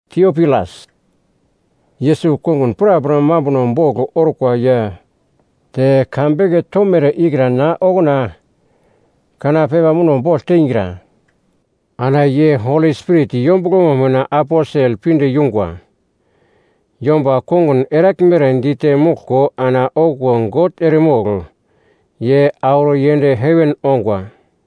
Tiopilas, Yesus kongun prapra mambuno bogl orkwa ya te ka beke tomere ikra na okuna kana pepa muno bogl teingra, ana ye Holi Spirit yombuglomo mina aposel pinde yungwa yomba kongun eraglmere dite moglko ana okuwo God eremogl ye auro yend heven ongwa.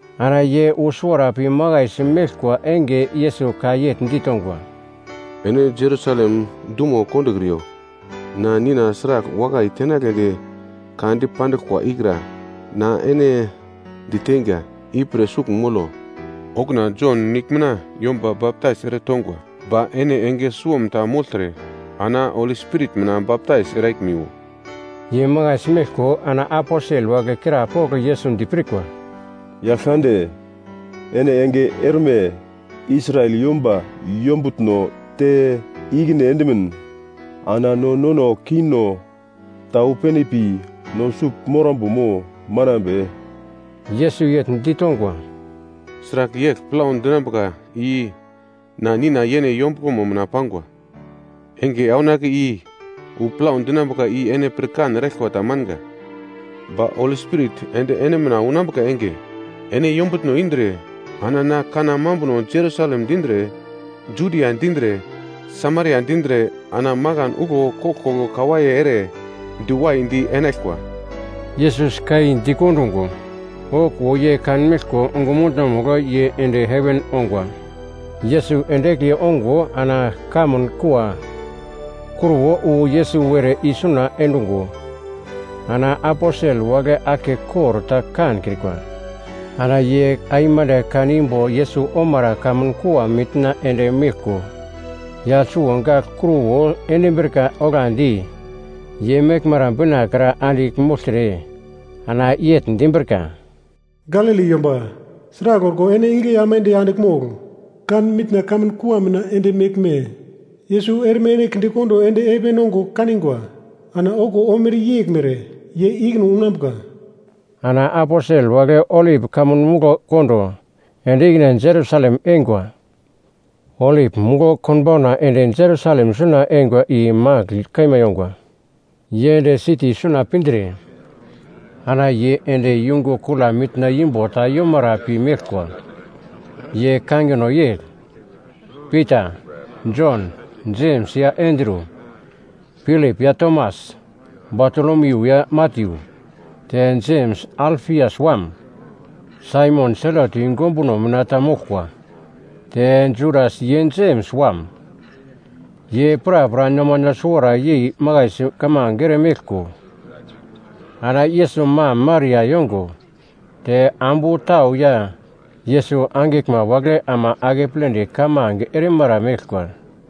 Ana ye wu suwara pi makaisi meglkwa enge Yesus ka yegl ditongwa, “Ene Jerusalem dumo kondokriyo. Na Nina sragl wakai tenagledi ka dipandiglkwa ikra na ene diteinga, ipre sugl molo. Okuna Jon nigl mina yomba baptais eretongwa, ba ene enge suwomta mogltre ana Holi Spirit mina baptais eraglmiwo.” Ye makaisi meglko ana aposel wagle krapogl Yesus dipirkwa, “Yaglkande, ene enge erme Israel yomba yombutno te ikine endimin, ana no nono kingno ta wu pene pi no sugl morambo mo manambe?” Yesus yegl ditongwa, “Sragl yegl plau dinambuka i na Nina yene yombuglomo mina pangwa. Enge aunake i wu plau dinambuka i ene pirkan eraglkwa tamanga. Ba Holi Spirit ende ene mina unambuka enge, ene yombutno indre ana na kanna mambuno Jerusalem dindre, Judia dindre, Samaria dindre ana makan uglo koglkoglo kawaiye ere diwaidi enaglkwa.” Yesus ka i dikondungo, okuwo ye kanmeglko ongumutno-mugl ye ende heven ongwa. Yesus ende egli ongo ana kamun kua kruwo wu Yesus were isuna endungo ana aposel wagle aglkekor ta kankrikwa. Ana ye aimande kanimbo Yesus omara kamun kua mitna ende meglko, yagl suwo gagl kruwo endimbrika oglandi ye meglmara bina kra andigl mogltre, ana yegl dimbrika, “Galili yomba! Sragl orko ene igle aimande andigl mogl kan mitna kamun kua mina ende meglme? Yesus erme ene kindekondo ende heven ongo kanigwa, ana okuwo omere yeglmere ye ikine unambuka.” Ana aposel wagle Olip Kamun Muglo kondo ende ikine Jerusalem eingwa. Olip Muglo konbauna ende Jerusalem suna eingwa i magl kaima yongwa. Ye ende siti suna pindre, ana ye ende yungu kula mitna imbo ta yomara pi meglkwa. Ye kangino yegl Pita, Jon, Jems ya Andru, Pilip ya Tomas, Batolomiu ya Matyu, te Jems Alfias wam, Saimon Selot yungu ombuno mina ta moglkwa te Judas ye Jems wam. Ye prapra nomano suwara yei makaisi kamange eremeglko ana Yesus mam Maria yongo te ambu tau ya Yesus angiglma wagle ama akepledi kamange erimara meglkwa.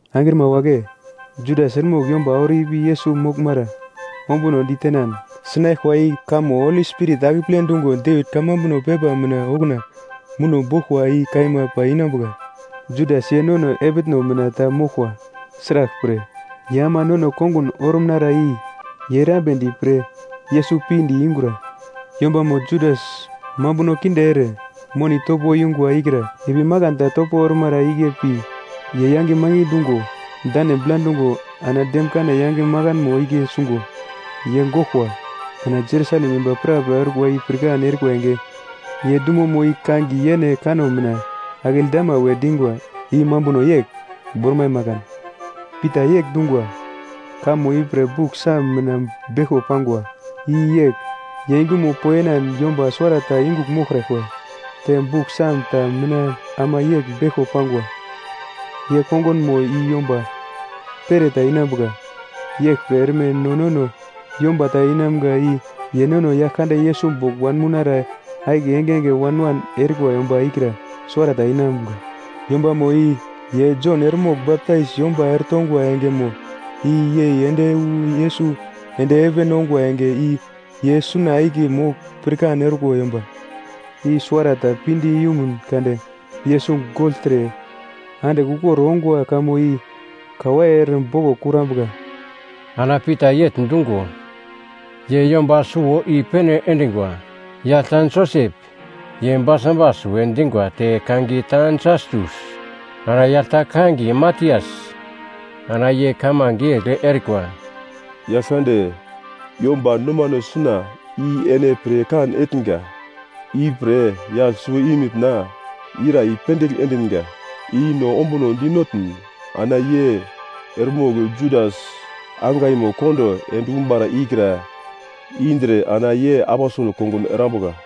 “Angrima wagle! Judas eremogl yomba auro ipi Yesus moglmara ombunodi tenan sikane sinaglkwa i kamo Holi Spirit akeple dungo Devit kamambuno pepa mina okuna muno boglkwa i kaima pai inambuka. Judas ye nono epitno mina ta moglkwa, sraglpre, ye ama nono kongun orumnara i ye erambedi pre Yesus pinde yungura.” (Yombamo Judas mambuno kinde ere moni topo yungwa ikra ipi makan ta topo ormara igle pi ye yange mangi dungo, dane bla dungo ana demkane yange makanmo igle sungo ye goglkwa. Ana Jerusalem yomba prapra orkwa i pirkan erikwa enge, ye dumomo i kangiye yene kanno mina, “Akeldama” we dingwa i mambuno yegl, Bormai Makan.) Pita yegl dungwa, “Kamo ipre Buk Song mina beglko pangwa, “‘I yegl ye yungumo poyenan yomba suwarata yungugl moglkraglkwa.’ Te Buk Song ta mina ama yegl beglko pangwa, “‘Ye kongunmo i yomba pereta inambuka.’ Yeglpre erme nono yomba ta inamga i ye nono Yaglkande Yesus bogl wanmounara akiye engenge wan-wan erikwa yomba ikra suwarata inamga. Yombamo i ye Jon eremogl baptais yomba eretongwa engemo i yei ende wu Yesus ende heven ongwa enge i ye suna akiye mogl pirkan orkwa yomba, i suwarata pinde yumun kade Yesus gogltre andigl ukor ongwa kamo i kawaiye ere boglo kurambuka!” Ana Pita yegl dungo, ye yomba suwo i-pene endingwa: Yagl ta Josep (ye Barsabas we dingwa te kangiye ta Jastus), ana yagl ta kangiye Matias. Ana ye kamange yegl erikwa, “Yaglkande, yomba nomano suna i ene pirkan etnga, ipre yagl suwo i mina ira i-pendigl endinga i no ombuno dinotn, ana ye eremogl Judas angaimo kondo endumara ikra indre ana ye aposel kongun erambuka.”